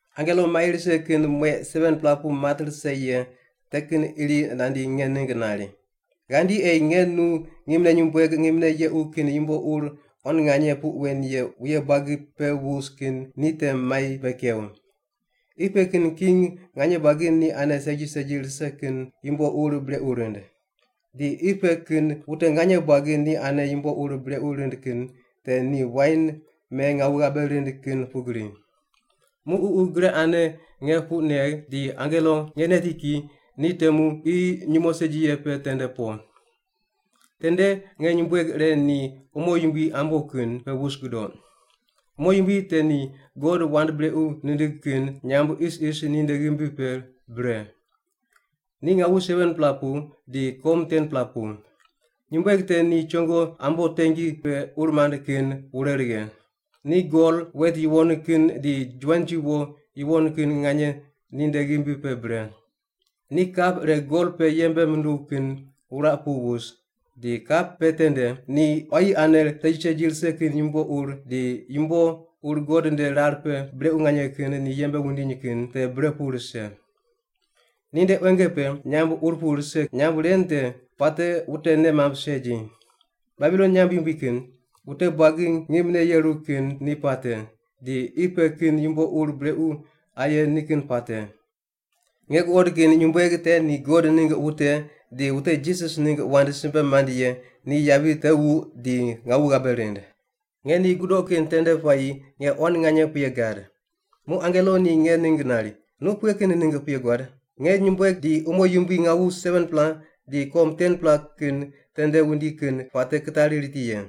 Angelo mai rise kin mueq 7-pela pu mat rise ye te kin iri nandi nge ningg nari, “Ghandi ei nge nu ngimne nyumbueg ngimne yequ kin yumbo ur quan nganye puq wen ye wuye buagi pe wus kin ni te mai bei kew. Qi pe kin king nganye buagi ni ane segi segi rise kin yumbo ur brequ rind. Di qi pe kin wute nganye buagi ni ane yumbo ur brequ rind kin te ni wain me ngawu ghabe rind kin pugri.” Muq Ququ gre ane nge puq negh di angelo nge neti ki di temu qi nyumo segi ye pe tende po. Tende nge nyumbueg ire ni umo yumbui ambo kin pe wus gudoq. Umo yumbui te ni God wand brequ nindig kin nyamb isis ninde ghimbi pe bre. Ni ngawu 7-pela pu di kom 10-pela pu. Nyumbueg te ni chongo ambo tengi pe ur mand kin wure righe. Ni gol, wet yuwon kin di juwanji wo yuwon kin nganye ninde ghimbi pe bre. Ni kap ire gol pe yembe munduw kin wuraq pu wus, di kap pe tende ni quayi ane segi segi rise kin yumbo ur di yumbo ur God nde rar pe brequ nganye kin ni yembe wundiny kin te bre pu rise. Ninde quenge pe nyamb ur pu rise, nyamb ren kin puate wute nei mamb segi: Babilon nyamb yumbui kin; Wute buagi ngimne yeru kin ni puate; di Qi pe kin yumbo ur brequ aye ni kin puate. Nge guqod kin nyumbueg te ni God ningg wute di wute Jisas ningg wand simbe mand ye ni yavi te wuq di ngawu ghabe rind. Nge ni gudoq kin tende puayi nge quan nganye puye gad. Muq angelo ni nge ningg nari, “Nu pughe kin ningg puye guad? Nge nyumbueg di umo yumbui ngawu 7-pela di kom 10-pela kin tende wundi kin puate kitari riti ye.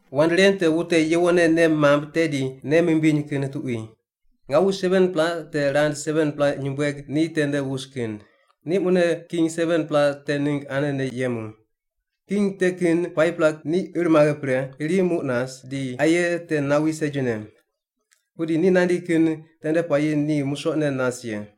“Wand ren te wute yuwonne nei mamb tedi nei mimbiny kin tuqui. Ngawu 7-pela te rand 7-pela nyumbueg ni tende wus kin. Ni mune king 7-pela te ningg anene yemu. King te kin 5-pela ni ir maghe pre, iri muq nas, di aye te nawi segine. Pudi ni nandi kin tende puayi ni musoqne nas ye.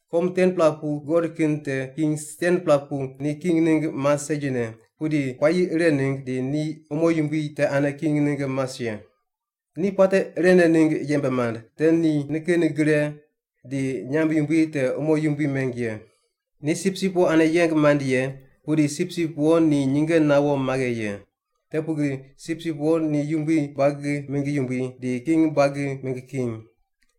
“Kom 10-pela pu guqod kin te king 10-pela pu ni king ningg mas segine, pudi puayi ire ningg di ni umo yumbui te ane king ningg mas ye. Ni puate irene ningg yembe mand te ni nikin gre di nyamb yumbui te umo yumbui meng ye. Ni Sipsip Wo ane yeng mand ye, pudi Sipsip Wo ni nyinge nawo maghe ye. Te pugri Sipsip Wo ni yumbui buagi mingg yumbui di king buagi mingg king.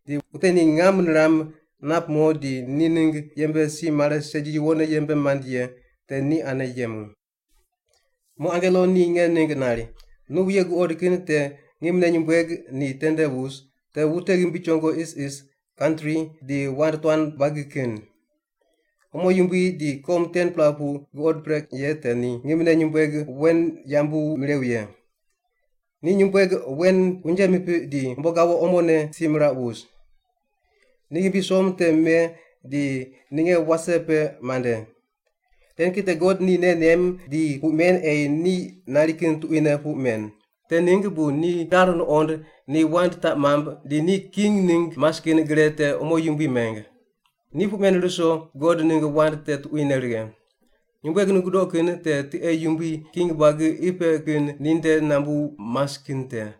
Di wute ni ngam niram, nap mo di ni ningg yembe si mare segi yuwonne yembe mand ye te ni ane yemu.” Muq angelo ni nge ningg nari, “Nu wuye guqod kin te ngimne nyumbueg ni tende wus, te wute ghimbi chongo isis, kantri, di wand tuan buagi kin. Umo yumbui di kom 10-pela pu guqod pre ye te ni ngimne nyumbueg wen yambu mirew ye. Ni nyumbueg wen unje mipiq di umbo gawo omone si miraq wus. Ni ghimbi som te me di ninge wase pe mande. Ren kin te God ni nei nem di puq men ei ni nari kin tuquine puq men. Te ningg bu ni rar nuqond ni wand taq mamb di ni king ningg mas kin gre te umo yumbui meng. Ni puq men ruso God ningg wand te tuquine righe. Nyumbueg nu gudoq kin te tiqe yumbui king buagi qi pe kin ninde nambu mas kin te.”